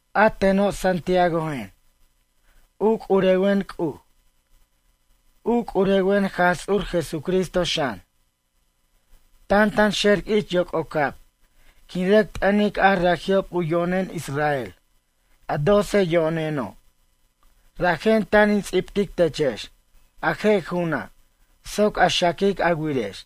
A teno' Santiagojen. U c'urewen C'uj. U c'urewen Jaj Ts'ur Jesucristo xan. Tantanxer ich yoc'ocab quin rʌc t'ʌnic a raji'ob u yo'nen Israel, a doce yo'neno', rajen tan in ts'ibtic techex a je' ju'una' soc a xaquic a wirex.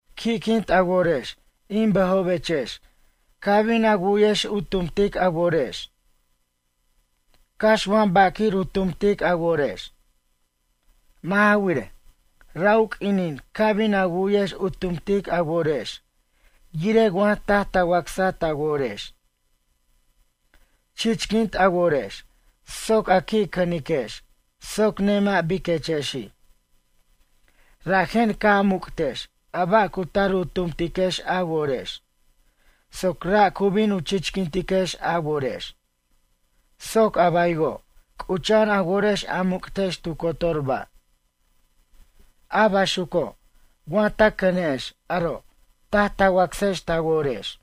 Qui'quint a worex in bʌjobechex ca' bin a wu'yex u tumtic a worex. Cax wa ba' quir u tumtic a worex. Mʌ' ja wirej, ra' u q'uinin ca' bin a wu'yex u tumtic a worex yirej wa taj ta wacsa ta worex. Chichquint a worex soc a qui' cʌniquex soc nemʌ' biquechexi'. Rajen ca' a muc'tex a ba' cu tar u tumtiquex a worex soc ra' cu bin u chichquintiquex a worex soc abaywo' c'ucha'an a worex a muc'tex tu cotor ba'. A baxuco' wa ta cʌne'ex aro' taj ta wacsex ta worex.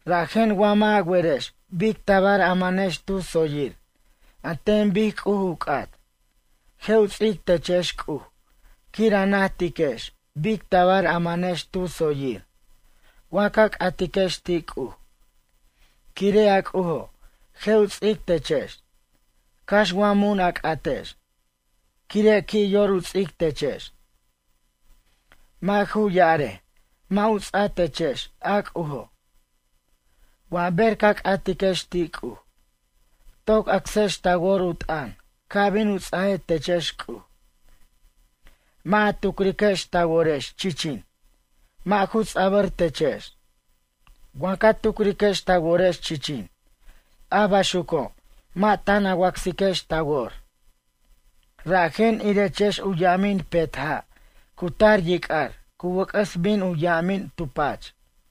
Rajen wa mʌ' a werex bic tabar a mʌnex tu tsoyir an ten bic C'uj u c'at, je' u ts'ic techex C'uj quir a najtiquex bic tabar a mʌnex tu tsoyir wa ca c'atiquex ti' C'uj. Quire' a C'ujo' je' u ts'ic techex, cax wa mun a c'atex, quire' qui' yor u ts'ic techex. Mʌ' ju ya'arej mʌ' u ts'a techex a C'ujo'. Wa ber ca c'atiquex ti' C'uj, toc acsex ta wor u t'ʌn ca' bin u ts'aje techex C'uj. Mʌ' a tucriquex ta worex chichin, mʌ' ju ts'a'bʌr techex. Wa ca tucriquex ta worex chichin, a baxuco' mʌ' tan a wacsiquex ta wor, rajen irechex u yamin petja' cu tar yic'ar cu wʌc'ʌs bin u yamin tu pach.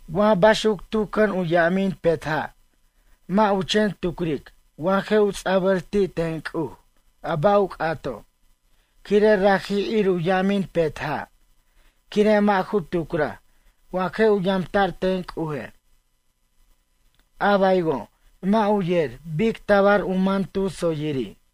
Wa baxuc tu cʌn u yamin petja'. Mʌ' u chen tucric wa je' u ts'a'bʌr ti' ten C'uj a ba' u c'ato' quire' raji' ir u ya'amin petja' quire' mʌ' ju tucraj wa je' u yamta'r ten C'uje'. A baywo' mʌ' u yer bic tabar u man tu tsoyiri'.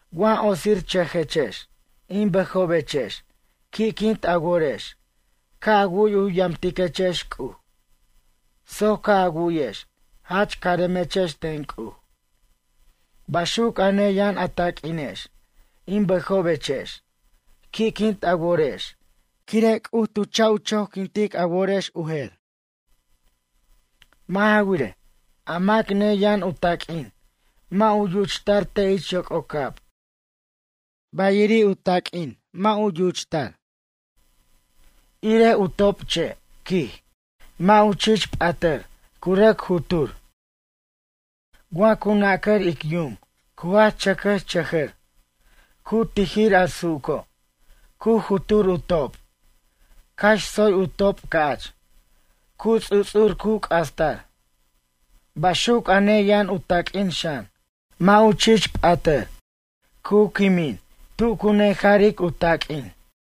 Wa otsirchʌjechex in bʌjobechex qui'quint a worex ca' a wu'y u yamtiquechex C'uj, tsoy ca' a wu'yex jach caremechex ten C'uj. Baxuc a neyʌn a taq'uinex in bʌjobechex qui'quint a worex quire' C'uj tu cha' u choquint a worex u jer. Mʌ' ja wirej, a mac neyʌn u taq'uin mʌ' u yuchtar te' ich yoc'ocab bayiriri' u taq'uin mʌ' u yuchtar. Irej u topche', quij, mʌ' u chich p'atʌr cu rʌc jutur. Wa cu nacar ic yum cu jach chʌcʌchʌjʌr, cu tijir a su'uco', cu jutur u top', cax tsoy u top' ca'ch, cu ts'uts'ur cu c'astar. Baxuc a neyʌn u taq'uin xan, mʌ' u chich p'atʌr, cu quimin tu cu nejaric u taq'uin.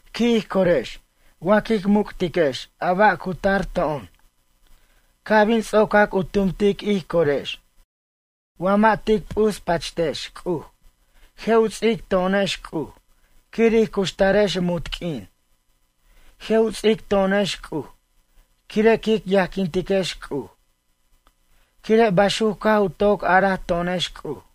Qui' ij corex wa quic muc'tiquex a ba' cu tar to'on. Ca' bin ts'ocac u tumtic ij corex wa mʌ' tic p'uspachtex C'uj, je' u ts'ic to'onex C'uj quir ij cuxtarex munt q'uin. Je' u ts'ic to'onex C'uj quire' quic yajquintiquex C'uj, quire' baxuc caj u toc ara to'onex C'uj.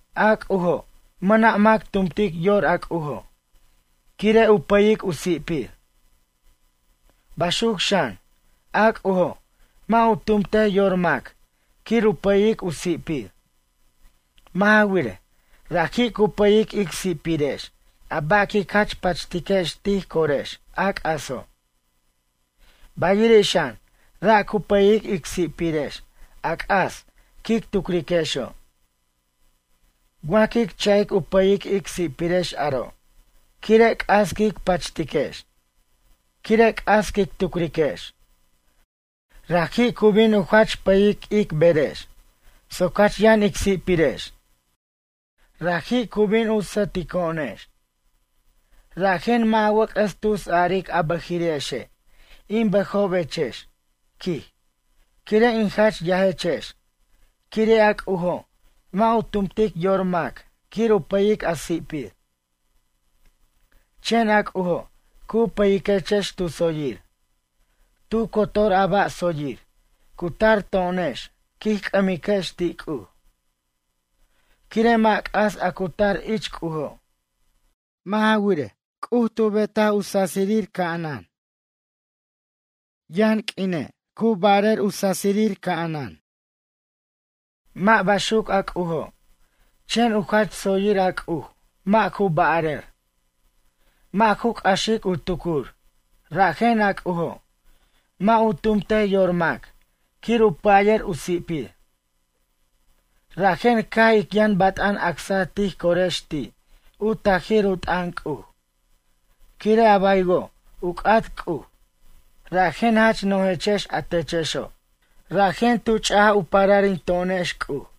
A C'ujo', mʌna' mac tumtic yor a C'ujo' quire' u pʌyic u si'pir. Baxuc xan, a C'ujo', mʌ' u tumtej yor mac quir u pʌyic u si'pir. Mʌ' ja wirej, raji' cu pʌyic ic si'pirex a ba' quic jach pachtiquex tij corex, a c'aso'. Bayiri' xan ra' cu pʌyic ic si'pirex a c'as quic tucriquexo'. Wa quic cha'ic u pʌyic ic si'pirex aro' quire' c'as quic pachtiquex, quire' c'as quic tucriquex. Raji' cu bin u jach pʌyic ic berex soc jach yʌn ic si'pirex. Raji' cu bin sʌtico'onex. Rajen mʌ' a wʌc'ʌs tus aric a bʌjiri'exe' in bʌjobechex, quij, quire' in jach yajechex quire' a C'ujo' mʌ' u tumtic yor mac quir u pʌyic a si'pir. Chen a C'ujo' cu pʌyiquechex tu tsoyir. Tu cotor a ba' tsoyir cu tar to'onex quij c'ʌmiquex ti' C'uj. Quire' mʌ' c'as a cu tar ich C'ujo'. Mʌ' ja wirej, C'uj tu bet u sasirir ca'anan. Yʌn q'uine' cu ba'ar u sasirir ca'anan. Mʌ' baxuc a C'ujo', chen u jach tsoyir a C'uj mʌ' ju ba'arʌr. Mʌ' ju c'axic u tucur rajen a C'ujo' mʌ' u tumte yor mac quir u pʌyir u si'pir. Rajen caj ic yʌn bat'an acsaj tij corex ti' u tajir u t'ʌn C'uj quire' a baywo' u c'at C'uj, rajen jach nojechex a techexo'. Rajen tu ch'aj u pararinto'onex C'uj.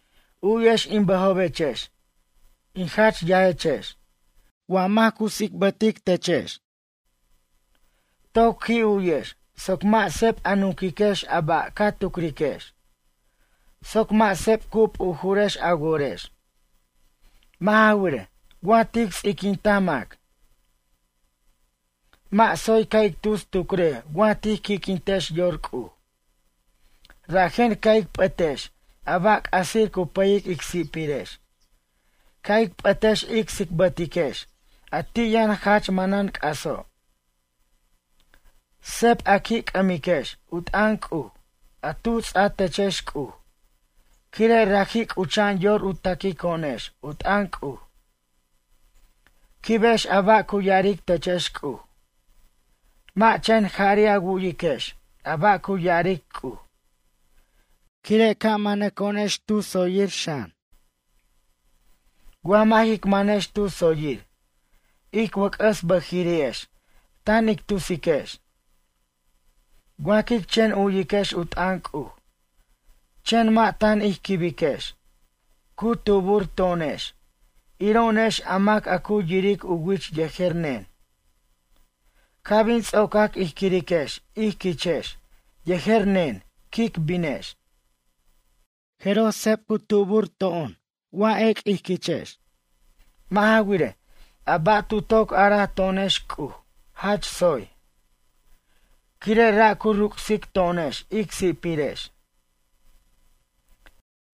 U'yex in bʌjobechex in jach yajechex wa mac cu tsicbʌtechex. Toc qui' u'yex soc mʌ' seb a nunquiquex a ba' ca tucriquex, soc mʌ' seb cu p'ujurex a worex. Mʌ' ja wirej, wa tic ts'iquenta mac. Mʌ' tsoy ca' ic tus tucrej wa tij qui'quintex yor C'uj. Rajen ca' ic p'ʌtex a ba' c'asir cu pʌyic ic si'pirex, ca' ic p'ʌtex ic tsicbʌtiquex a ti' yʌn jach manan c'aso'. Seb a qui' c'ʌmiquex u t'ʌn C'uj a tu ts'a techex C'uj quire' raji' c'ucha'an yor u taquico'onex u t'ʌn C'uj. Quibex a ba' cu ya'aric techex C'uj. Mʌ' chen jari' a wu'yiquex a ba' cu ya'aric C'uj. Quire' ca' manaco'onex tu tsoyir xan. Wa mʌ' jic manex tu tsoyir, ic wʌc'ʌs bʌjiri'ex tan ic tusiquex. Wa quic chen u'yiquex u t'ʌn C'uj chen mʌ' tan ij quibiquex, cu tubur to'onex iro'onex a mac a cu yiric u wich yejer nen. Ca' bin ts'ocac ij quiriquex ij quichex yejer nen quic binex. Jeroj seb cu tubur to'on wa ec' ij quichex. Mʌ' ja wirej, a ba' tu toc araj to'onex C'uj jach tsoy. Quire' ra' cu ruc'sic to'onex ic si'pirex.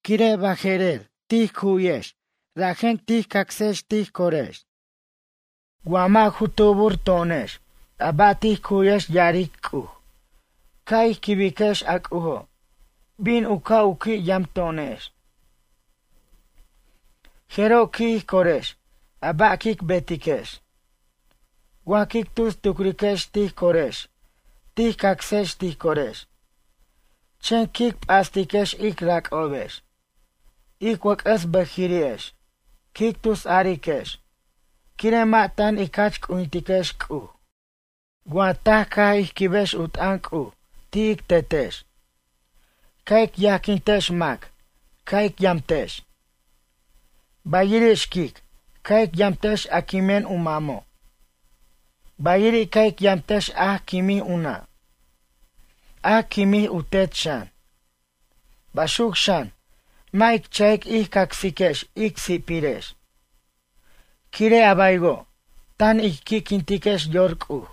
Quire' baje'rer tij cu'yex rajen tic acsex tij corex. Wa mʌ' ju tubur to'onex a ba' tij cu'yex ya'aric C'uj. Ca' ic quibiquex a C'ujo' bin u ca' u qui' yamto'onex. Jeroj qui' ij corex a ba' quic betiquex. Wa quic tus tucriquex tij corex tij cacsex tij corex. Chen quic p'astiquex ic rac'obex. Ic wʌc'ʌs bʌjiri'ex quic tusariquex quire' mʌ' tan ic jach c'ujintiquex C'uj. Wa taj caj ij quibex u t'ʌn C'uj ti' ic Tetex. Ca' ic yajquintex mac ca' ic yamtex. Bayiri' xquic ca' ic yamtex a quimen u mamo'. Bayiri' ca' ic yamtex a quimij u nʌ', a quimij u tet xan. Baxuc xan mʌ' ic cha'ic ij cacsiquex ic si'pirex. Quire' a baywo' tan ic qui'quintiquex yor C'uj.